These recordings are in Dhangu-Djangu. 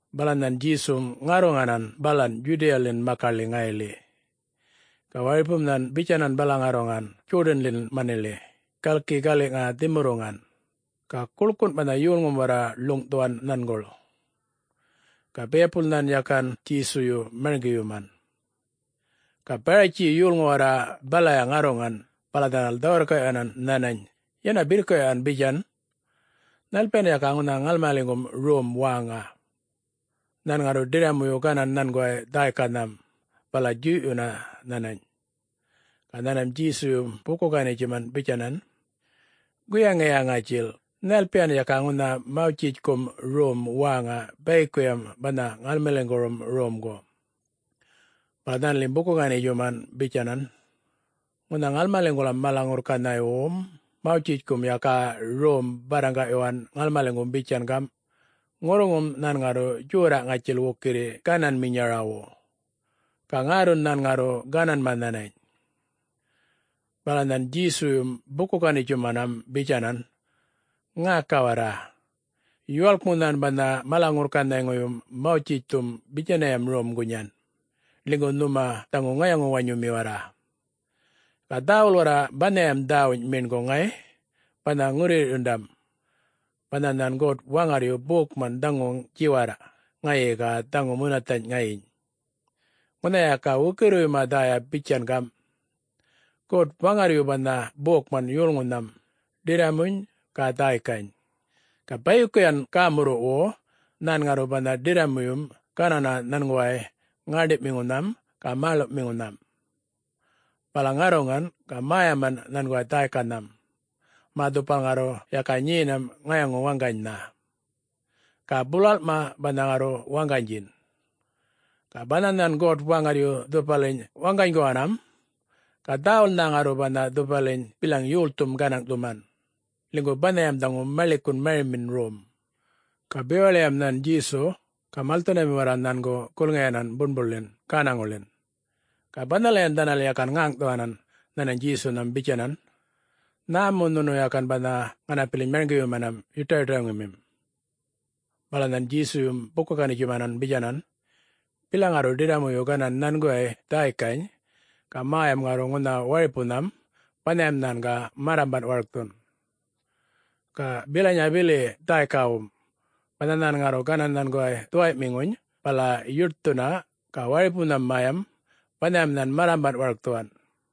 Bala nhan Djesum ŋarruŋanan balan Djudiyaḻin makaḻi ŋayiḻi. Ga waripum nhan bitjanan bala ŋarruŋan Djodinḻin maniḻi galki gali dhimurruŋan. Ga guḻkun banha yolŋum warra ḻuŋꞌthuwan nhanguḻ. Ga biyapul nhan yakan Djesuyu marŋgiyuman. Ga Baratji yolŋu warra balaya ŋarruŋan bala dhanal dhä-wirrkaꞌyuwanan nhanany, yäna birrkaꞌyuwan bitjan, “Nhalpiyan yaka ŋunha ŋalmaliŋgum rom wäŋa,... nhan ŋarru ḏirramuyu ganan nhanguway dhäykanham bala djuyꞌyunna nhanany?” Ga nhanmam Djesuyum buku-ganitjumanan bitjanan, “Guyaŋiya ŋatjil, nhalpiyan yaka ŋunha Mawtjitjkum Rom wäŋa bayikuyam banha ŋalmaliŋgurum romgu?” Bala dhanalim buku-ganitjuman bitjanan, “Ŋunha ŋalmaliŋguram mala-ŋurrkanhayŋuwum Mawtjitjkum yaka rom barraŋgaꞌyuwan ŋalmaliŋgum bitjan gamꞌ: Ŋurruŋum nhan ŋarru djorraꞌ ŋatjil wukirri gananminyarawu, ga ŋärrun nhan ŋarru gananma nhanany.” Bala nhan Djesuyum buku-ganitjumanam bitjanan, “Ŋäka warra! Yuwalkmu nhan banha mala-ŋurrkanhayŋuyum Mawtjitjthum bitjanayam rom gunyan, ḻinygu nhuma dhaŋu ŋayaŋu-wanyumi warra. Ga dhäwul warra banhayam dhäwuny meṉguŋ ŋay, banha ŋurruyirrꞌyundam, banha nhan God-Waŋarryu bokman dhaŋu djiwarrꞌ ŋayi ga dhaŋu munathanyꞌ ŋayiny! Ŋunha yaka wukirriwuyma dhäya bitjan gamꞌ, ‘God-Waŋarryu banha bokman yolŋunham, ḏirramuny ga dhäykany. Ga bayikuyan gämurruꞌwu nhan ŋarru banha ḏirramuyum ganan nhanguway ŋäṉdiꞌmiŋunham ga mäḻuꞌmiŋunham, bala ŋarruŋan ga mäyaman nhanguway dhäykanham, mä dhupal ŋarru yaka nyenam ŋayaŋu-waŋganynha, ga bulalꞌma banha ŋarru waŋganydjin.’ Ga banha nhan God-Waŋarryu dhupaliny waŋganyguwanam, ga dhäwulnha ŋarru banha dhupaliny bilaŋ yolthum gänaŋꞌthuman, ḻinygu banhayam dhaŋu maḻikun marimin rom!” Ga bewaḻiyam nhan Djesu ga malthundami warra nhangu gulŋiyanan buṉbuḻin gänaŋuḻin. Ga banhalayan dhanal yakan ŋäŋꞌthuwanan nhanany Djesunham bitjanan, “Nhä mu nhunu yakan banha ŋanapiliny marŋgiyumanam yuṯayuṯaŋumim?” Bala nhan Djesuyum buku-ganitjuman bitjanan, “Bilaŋ ŋarru ḏirramuyu ganan nhanguway dhäykany ga mäyam ŋarru ŋunha waripunham, banhayam nhan ga marrambanꞌ warkthun. Ga bilanyaya bili dhäykawum. Banha nhan ŋarru ganan nhanguway dhuwayꞌmiŋuny bala yuṯthuna ga waripunhan mäyam, banhayam nhan marrambanꞌ warkthuwan.”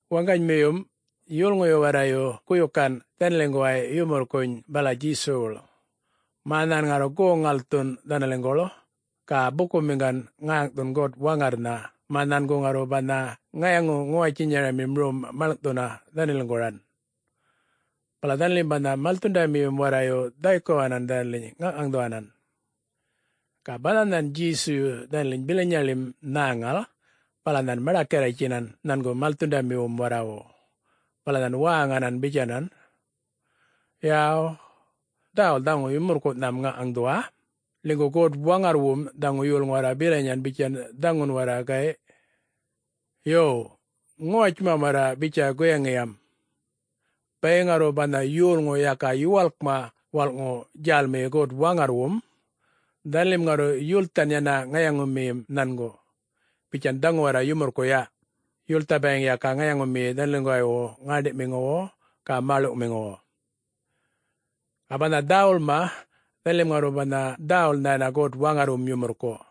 Waŋganymiyum, yolŋuyu warrayu guyukan dhanaliŋguway yumurrkunyꞌ bala Djesuwuḻ, mä nhan ŋarru goŋ-ŋalthun dhanaliŋguḻ ga bukumiŋgan ŋäŋꞌthun God-Waŋarrnha mä nhangu ŋarru banha ŋayaŋu-ŋuwatjinyaramim rom maḻŋꞌthuna dhanaliŋguran. Bala dhanalim banha malthundamiyum warrayu dhaykuwanan dhanaliny ŋaŋꞌŋaŋdhuwanan. Ga banha nhan Djesuyu dhanaliny bilanyaḻim nhäŋal, bala nhan maḏakarritjtjinan nhangu malthundamiwum warrawu bala nhan wäŋanan bitjanan, “Yaw, dhäwul dhaŋum yumurrkuꞌnham ŋaŋꞌŋaŋdhuwa, ḻinygu God-Waŋarrwum dhaŋu yolŋu warra bilanyan bitjan dhaŋun warra, gayꞌ. Yo, ŋuwatjuma warra bitja guyaŋiyam. Bayiŋ ŋarru banha yolŋu yaka yuwalkma walꞌŋu djälmiyi God-Waŋarrwum, dhanalim ŋarru yulthan yana ŋayaŋumiyim nhangu, bitjan dhaŋu warra yumurrkuꞌ yaꞌ yultha bayiŋ yaka ŋayaŋumiyi dhanaliŋguwaywu ŋäṉḏiꞌmiŋuwu ga mäḻuꞌmiŋuwu. Ga banha dhäwulma, dhanalim ŋarru banha dhäwulnha yana God-Waŋarrwum yumurrkuꞌ.”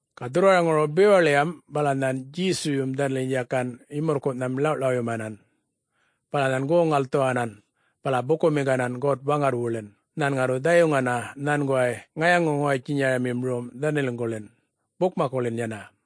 Ga dhurrwaraŋuru bewaḻiyam bala nhan Djesuyum dhanaliny yakan yumurrkunham ḻawꞌḻawyumanan, bala nhan goŋ-ŋalthuwanan bala bukumiŋganan God-Waŋarrwuḻin nhan ŋarru dhayuŋgana nhanguway ŋayaŋu-ŋuwatjinyamim rom dhanaliŋguḻin, bukmakkuḻin yana.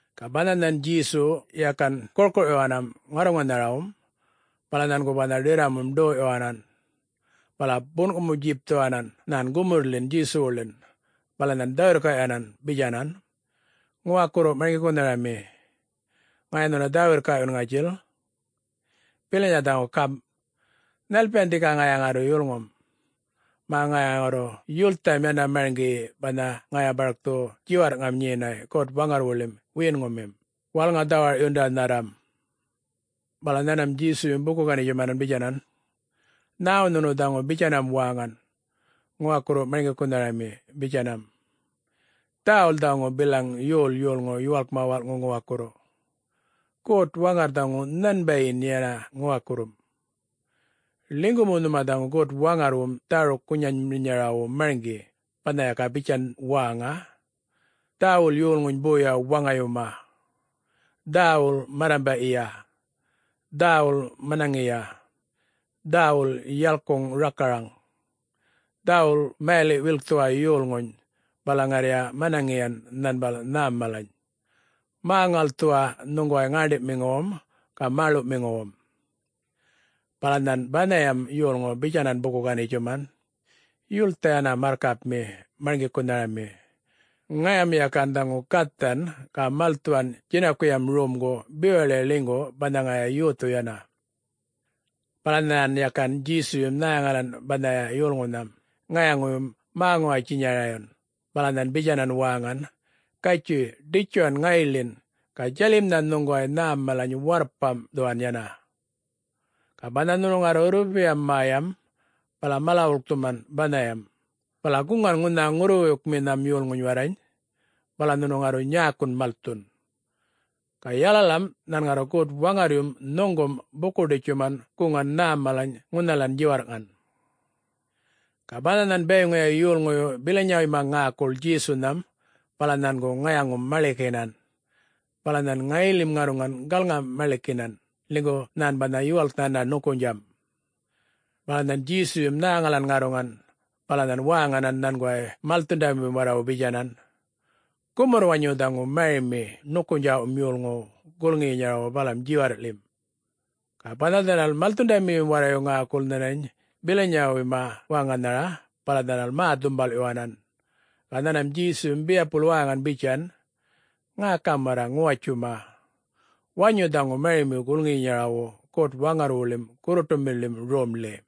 Ga banha nhan Djesu yakan gurkuꞌyuwanam ŋarruŋanharawum, bala nhangu banha ḏirramum ḏoyꞌyuwanan. Bala bunꞌkumu-djipthuwanan nhan gumurrḻin Djesuwuḻin bala nhan dhä-wirrkaꞌyuwanan bitjanan, “Ŋuwakurru Marŋgikunharami, ŋaya nhuna dhä-wirrkaꞌyun ŋatjil. Bilanya dhaŋu gamꞌ: Nhalpiyan dhika ŋaya ŋarru yulŋum, mä ŋaya ŋarru yultham yana marŋgiyi banha ŋaya barkthu djiwarrꞌŋam nyenay God-Waŋarrwuḻim wiyiŋumim, wälŋa-dhawarꞌyundanharram?” Bala nhanmam Djesuyum buku-ganitjuman bitjanan, “Nhäwu nhunu dhaŋu bitjanam wäŋan, ‘Ŋuwakurru Marŋgikunharami’? bitjanam. Dhäwul dhaŋu bilaŋ yol yolŋu yuwalkma walꞌŋu ŋuwakurru, God-Waŋarr dhaŋu nhanbayin yana ŋuwakurrum. Ḻinygu mu nhuma dhaŋu God-Waŋarrwum dhäruk-guŋanminyarawu marŋgi banha yaka bitjan wäŋa, ‘Dhäwul yolŋuny boya waŋayuma; Dhäwul marrambaꞌyiya; Dhäwul manaŋiya; Dhäwul yalkuŋ rakaraŋ; Dhäwul mayaliꞌ-wilkthuwa yolŋuny, bala ŋarriya manaŋiyan nhanbal nhäm malany; Mä-ŋalthuwa nhuŋguway ŋäṉḏiꞌmiŋuwum ga mäḻuꞌmiŋuwum.’” Bala nhan banhayam yolŋu bitjanan buku-ganitjuman, “Yultha yana marrkapmi marŋgikunharami. Ŋayam yakan dhaŋu gathan ga malthuwan djinakuyam romgu bewaḻi ḻinygu banha ŋaya yothu yana.” Bala nhan yakan Djesuyum nhäŋalan banhaya yolŋunham ŋayaŋuyum mä-ŋuwatjinyarayun bala nhan bitjanan wäŋan, “Gatjuy, ḏitjuwan ŋayiḻin ga djalimnha nhuŋguway nhäm malany warrpamꞌthuwan yana. Ga banha nhunu ŋarru rrupiyam mäyam bala mala-wulkthuman banhayam, bala guŋan ŋunha ŋurruwuykminhan yolŋuny warrany. Bala nhunu ŋarru nyäkun malthun. Ga yalalam nhan ŋarru God-Waŋarryum nhuŋgum buku-ḏitjuman guŋan nhä mala ŋunhalan djiwarrꞌŋan.” Ga banha nhan bayiŋuya yolŋuyu bilanyawuyma ŋäkul Djesunham, bala nhangu ŋayaŋum-maḻikinan. Bala nhan ŋayiḻim ŋarruŋan galŋa-maḻikiyinan, ḻinygu nhan banha yuwalk yana ṉukunydjamꞌ. Bala nhan Djesuyum nhäŋalan ŋarruŋan, bala nhan wäŋanan nhanguway malthundamiwum warrawu bitjanan, “Gumurr-wanyun dhaŋu marimi ṉukunydjaꞌwum yolŋuwu gulŋiyinyarawu balam djiwarrꞌḻim!” Ga banha dhanal malthundamiyum warrayu ŋäkul nhanany bilanywuyma wäŋanhara bala dhanal mä-dhumbalꞌyuwanan. Ga nhanmam Djesum biyapul wäŋan bitjan, “Ŋäkam warra ŋuwatjuma! Wanyu dhaŋu marimi gulŋiyinyarawu God-Waŋarrwuḻim gurruṯumiḻim romḻi.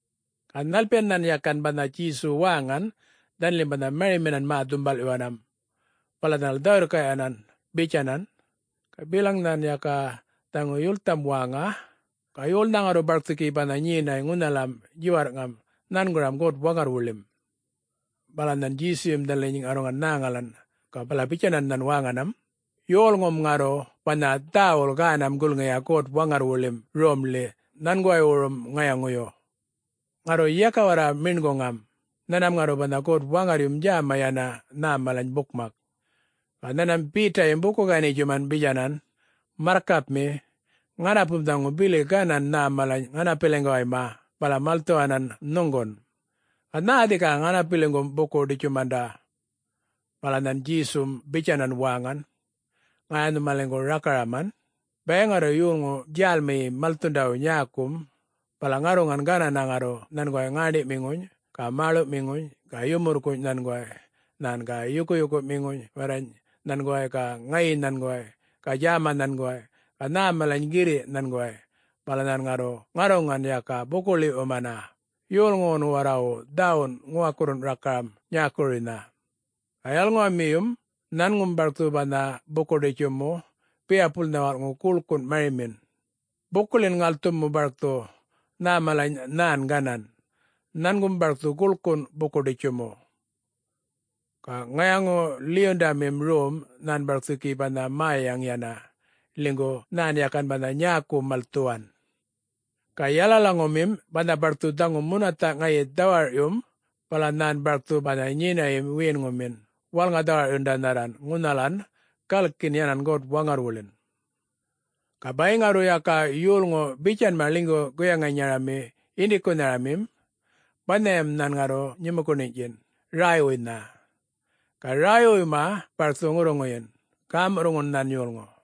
Ga nhalpiyan nhan yakan banha Djesu wäŋan, dhanalim banha marimin mä-dhumbalꞌyuwanam. Bala dhanal dhä-wirrkaꞌyunminan bitjanan, “Ga bilaŋ nhan yaka dhaŋu yultham wäŋa, ga yolnha ŋarru barkthu gi banha nyenay ŋunhalam djiwarrꞌŋam nhanguram God-Waŋarrwuḻim?” Bala nhan Djesuyum dhanaliny ŋarruŋan nhäŋalan, ga bala bitjanan nhan wäŋanam, “Yolŋum ŋarru banha dhäwul gänam gulŋiya God-Waŋarrwuḻim Romḻi nhanguwaywurum ŋayaŋuyu. Ŋarru yaka warra meṉguŋam, nhanmam ŋarru banha God-Waŋarryum djäma yana nhä malany bukmak.” Ga nhanmam Betayum buku-ganitjuman bitjanan, “Marrkapmi, ŋanapum dhaŋu bili ganan nhä malany ŋanapiliŋguwayma, bala malthuwanan nhuŋgun. Ga nhä dhika ŋanapiliŋgum buku-ḏitjumanda?” Bala nhan Djesum bitjanan wäŋan, “Ŋaya nhumaliŋgu rakaraman! Bayiŋ ŋarru yolŋu djälmiyi malthundawu nyäkum, bala ŋarruŋan ganana ŋarru nhanguway ŋäṉḏiꞌmiŋuny ga mäḻuꞌmiŋuny ga yumurrkunyꞌ nhanguway nhan ga yukuyukuꞌmiŋuny warrany nhanguway ga ŋayi nhanguway ga djäma nhanguway ga nhä malany girriꞌ nhanguway, bala nhan ŋarru ŋarruŋan yaka buku-ḻiwꞌyumana yolŋuwun warrawu dhäwun ŋuwakurrun rakaram nyäkuruynha. Ga yalalaŋumiyum nhangum barkthu banha buku-ḏitjumu biyapulnha walꞌŋu guḻkun marimin, bukuḻin-ŋalthumu barkthu. Nhä malany nhan ganan, nhangum barkthu guḻkun buku-ḏitjumu. Ga ŋayaŋu-ḻiyundamim rom nhan barkthu gi banha mäyaŋ yana, ḻinygu nhan yakan banha nyäku malthuwan. Ga yalalaŋumin banha barkthu dhaŋu munathaꞌ ŋayi dhawarꞌyum, bala nhan barkthu banha nyinayim wiyinŋumin wälŋa-dhawarꞌyundanharran ŋunhalan galkin yana God-Waŋarrwuḻin. Ga bayiŋ ŋarru yaka yolŋu bitjanma ḻinygu guyaŋinyarami yindikunharamim, banhayam nhan ŋarru nyumukuṉinyꞌtjin, räywuynha. Ga räywuyma barkthu ŋurruŋuyin, gämurruꞌŋun nhan yolŋu.”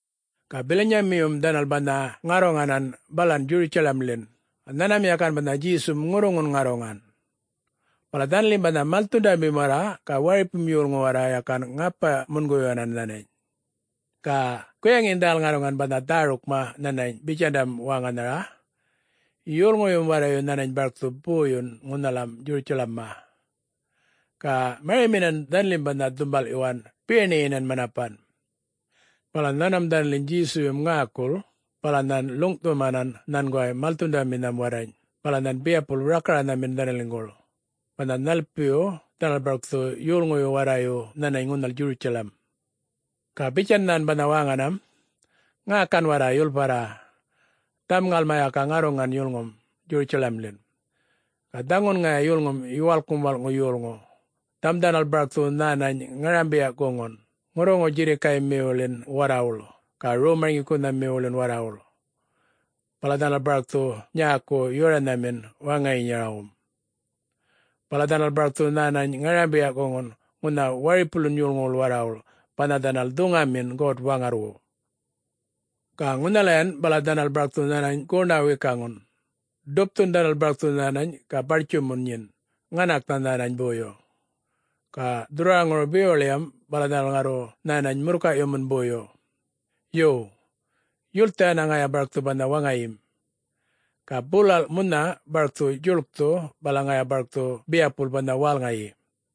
Ga bilanyamiyum dhanal banha ŋarruŋanan balan Djurutjalamḻin, ga nhanmam yakan banha Djesum ŋurruŋun ŋarruŋan, bala dhanalim banha malthundamim warra ga waripum yolŋu warra yakan ŋapa-munguyuwanan nhanany. Ga guyaŋin dhanal ŋarruŋan banha dhärukma nhanany bitjandam wäŋanhara, “Yolŋuyum warrayu nhänany barkthu boyun ŋunhalam Djurutjalamma.” Ga mariminan dhanaḻim banha dhumbalꞌyuwan, biyaṉiyinan manapan. Bala nhanmam dhanaliny Djesuyum ŋäkul bala nhan ḻuŋꞌthumanan nhanguway malthundaminham warrany, bala nhan biyapul rakaranhamin dhanaliŋguḻ, banha nhalpiyu dhanal barkthu yolŋuyu warrayu nhanany ŋunhal Djurutjalam. Ga bitjan nhan banha wäŋanam, “Ŋäkan warra yulparra! Dhaŋum ŋalma yaka ŋarruŋan yulŋum Djurutjalamḻin. Ga dhaŋun ŋaya yulŋum Yuwalkŋum Walꞌŋu Yolŋu, dhaŋum dhanal barkthu nhänany ŋarambiya-guŋun ŋurruŋu-djirrikaymiwuḻin warrawuḻ ga rom-marŋgikunhamiwuḻin warrawuḻ. Bala dhanal barkthu nyäku yoranhamin waŋayinyarawum. Bala dhanal barkthu nhänany ŋarambiya-guŋan ŋunha waripuwuḻin yolŋuwuḻ warrawuḻ, banha dhanal dhuŋanmin God-Waŋarrwu. Ga ŋunhalayan bala dhanal barkthu nhänany goṉa-wikaŋam. Dhupthun dhanal barkthu nhänany ga bartjumun nyin, ŋanaknha nhänany boyu. Ga dhurrwaraŋuru bewaḻiyam bala dhanal ŋarru nhänany murrkayꞌyumun boyu. Yo, yultha yana ŋaya barkthu banha waŋayim, ga bulalꞌ munha barkthu djuḻkthu bala ŋaya barkthu biyapul banha wälŋayi.”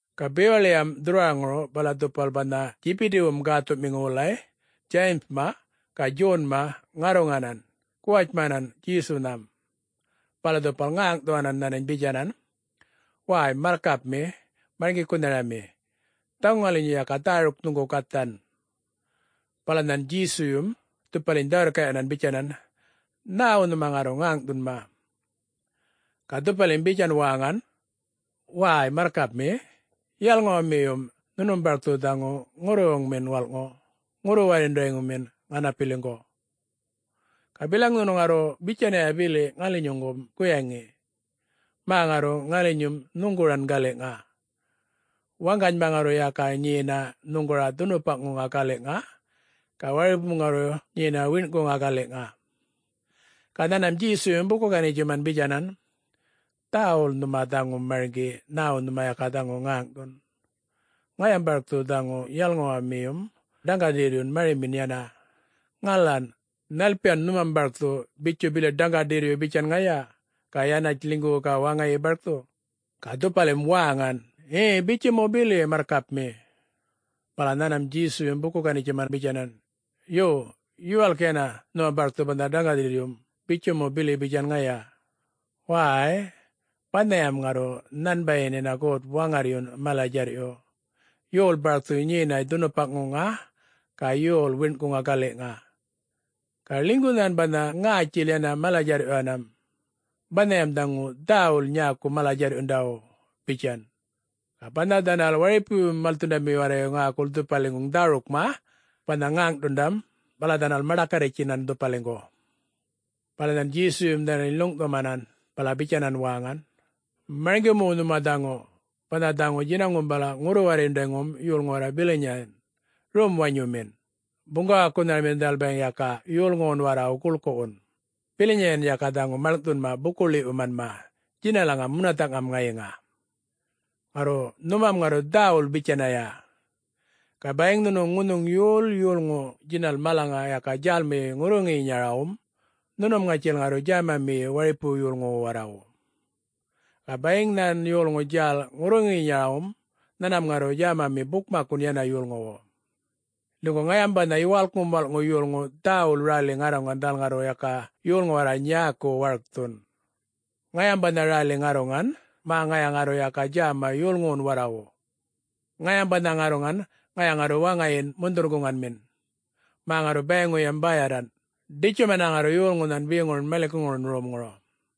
Ga bewaḻiyam dhurrwaraŋuru bala dhupal banha Djibidiwum gäthuꞌmiŋu wulay, Djayimma ga Djonma, ŋarruŋanan guwatjmanan Djesunham. Bala dhupal ŋäŋꞌthuwanan nhanany bitjanan, “Wäy, Marrkapmi Marŋgikunharami, dhaŋu ŋalinyu yaka dhäruk nhuŋgu gathan.” Bala nhan Djesuyum dhupaliny dhä-wirrkaꞌyuwanan bitjanan, “Nhäwu nhuma ŋarru ŋäŋꞌthunma?” Ga dhupalim bitjan wäŋan, “Wäy, Marrkapmi, yalalaŋumiyum nhunum barkthu dhaŋu ŋurruwuŋmin walꞌŋu, ŋurru-warryundamin ŋanapiliŋgu. Ga bilaŋ nhunu ŋarru bitjanaya bili ŋalinyuŋgum guyaŋi? Mä ŋarru ŋalinyum nhuŋguran galiꞌŋa. Waŋganyma ŋarru yaka nyena nhuŋgura dhunupaŋa galiꞌŋa, ga waripum ŋarru nyena wiṉꞌkuŋa galiꞌŋa.” Ga nhanmam Djesuyum buku-ganitjuman bitjanan, “Dhäwul nhuma dhaŋu marŋgi nhäwu nhuma yaka dhaŋu ŋäŋꞌthun. Ŋayam barkthu dhaŋu yalalaŋumiyum dhaŋgaḏirryun marimin yana. Ŋalan? Nhalpiyun nhumam barkthu,... bitju bili dhaŋgaḏirryu bitjan ŋaya, ga yanatj ḻinygu ga waŋayi barkthu?” Ga dhupalim wäŋan, “Ŋe,... bitju mu bili, Marrkapmi.” Bala nhanmam Djesuyum buku-ganitjuman bitjanan, “Yo, yuwalk yana nhuma barkthu banha dhaŋgaḏirryum, bitju mu bili bitjan ŋaya. Wäy-y, banhayam ŋarru nhanbayin yana God-Waŋarryun mala-djarryuꞌ, yol barkthu nyenay dhunupaŋa ga yol wiṉꞌkuŋa galiꞌŋa. Ga ḻinygu nhan banha ŋätjil yana mala-djarrꞌyuwanam. Banhayam dhaŋu dhäwul nyäku mala-djarrꞌyundawu,” bitjan. Ga banha dhanal waripuyum malthundamiyu warrayu ŋäkul dhupaliŋguŋ dhärukma banha ŋäŋꞌthundam, bala dhanal maḏakarritjinan dhupaliŋgu. Bala nhan Djesuyum dhanaliny ḻuŋꞌthumanan bala bitjanan wäŋan, “Marŋgi mu nhuma dhaŋu: banha dhaŋu djinaŋum bala ŋurru-warryundayŋum yolŋu warra bilanyayan, rom-wanyumin, buŋgawakunharamin dhanal bayiŋ yaka yolŋuwun warrawu guḻkuꞌwun. Bilanyan yaka dhaŋu maḻŋꞌthunma buku-ḻiwꞌyumanma djinalam munathaꞌŋam ŋayiŋa. Ŋarru nhumam ŋarru dhäwul bitjanya. Ga bayiŋ nhunu ŋunhuŋ yol yolŋu djinal malaŋa yaka djälmiyi ŋurruŋuyinyarawum, nhunum ŋatjil ŋarru djämamiyi waripuwu yolŋuwu warrawu. Ga bayiŋ nhan yolŋu djäl ŋurruŋuyinyarawum, nhanmam ŋarru djämami bukmakkun yana yolŋuwu. Ḻinygu ŋayam banha Yuwalkŋum Walꞌŋu Yolŋu dhäwul räli ŋarruŋan dhanal ŋarru yaka yolŋu warra nyäku warkthun. Ŋayam banha räli ŋarruŋan, mä ŋaya ŋarru yaka djäma yolŋuwun warrawu. Ŋayam banha ŋarruŋan ŋaya ŋarru waŋayin mundhurr-guŋanmin, mä ŋarru bayiŋuyam bäyarran, ḏitjumana ŋarru yolŋunhan beŋurun maḻikuŋurun romŋuru.”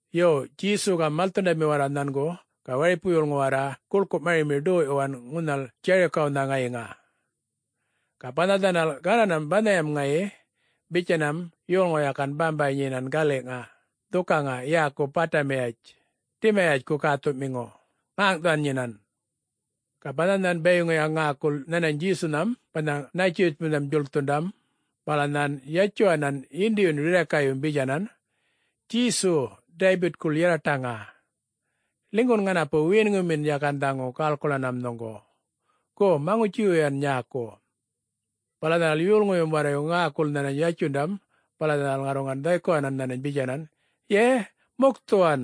Yo, Djesu ga malthundami warra nhangu ga waripu yolŋu warra guḻku marimi ḏoyꞌyuwan ŋunhal Djarikawnha ŋayiŋa. Ga banha dhanal gananam banhayam ŋayi, bitjanam yolŋu yakan bambay nyenan galiꞌŋa dhukaŋa yäku Bätimayatj, Dimayatjku gäthuꞌmiŋu, ŋäŋꞌthuwan nyinan. Ga banha nhan bayiŋuya ŋäkul nhanany Djesunam banha Nätjiritjpuynam djuḻkthundam, bala nhan yatjuwanan yindiyun rirrakayyum bitjanan, “Djesu, Daybitkuḻ yarraṯaŋa, ḻinygun ŋanapu wiyinŋumin yakan dhaŋu gäḻkuḻanam nhuŋgu. Gu, maŋutji-wuyuwan nyäku.” Bala dhanal yolŋuyum warrayu ŋäkul nhanany yatjundam, bala dhanal ŋarruŋan dhaykuwanan nhanany bitjanan, “Ye,... mukthuwan!”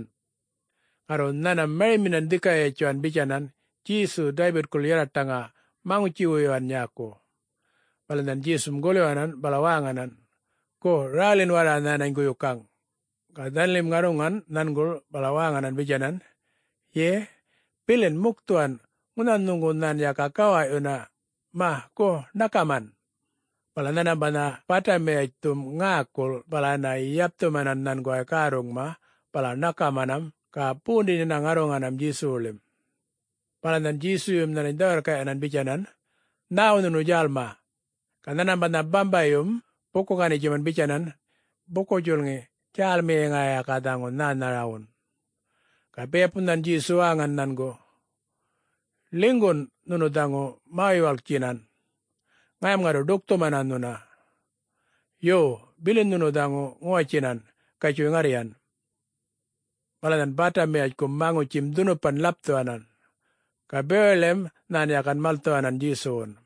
Ŋarru nhanmam mariminan dhika yatjuwan bitjanan, “Djesu! Daybitkuḻ yarraṯaŋa, maŋutji-wuyuwa nyäku!” Bala nhan Djesum gulyuwanan bala wäŋanan, “Gu, rälin warra nhänany guyukaŋ!” Ga dhanalim ŋarruŋan nhanguḻ, bala wäŋanan bitjanan, “Ye, bilin, mukthuwan. Ŋunha nhuŋgu nhan yaka gawaꞌyuna. Maꞌ, gu ṉakaman!” Bala nhanmam banha Bätimayatjthum ŋäkul, bala yana yapthumanan nhanguway gärruŋma bala ṉakamanam ga bondin yana ŋarruŋanam-Djesuwuḻim.” Bala nhan Djesuyum nhanany dhä-wirrkaꞌyuwan bitjanan, “Nhäwu nhunu djälma?” Ga nhanmam banha bambayyum buku-ganitjuman bitjanan, “Buku-djulŋi, djälmiyi ŋaya yaka dhaŋu nhänharawun.” Ga biyapul nhan Djesu wäŋan nhangu, “Ḻinygun nhunu dhaŋu mä-yuwalktjinan, ŋayam ŋarru ḏukthumana nhuna. Yo, bilin nhunu dhaŋu ŋuwatjinan, gatjuy ŋarryan!” Bala nhan Bätimayatjkum maŋutjim dhunupan ḻapthuwanan. Ga bewaḻiyam nhan yakan malthuwanan Djesuwun.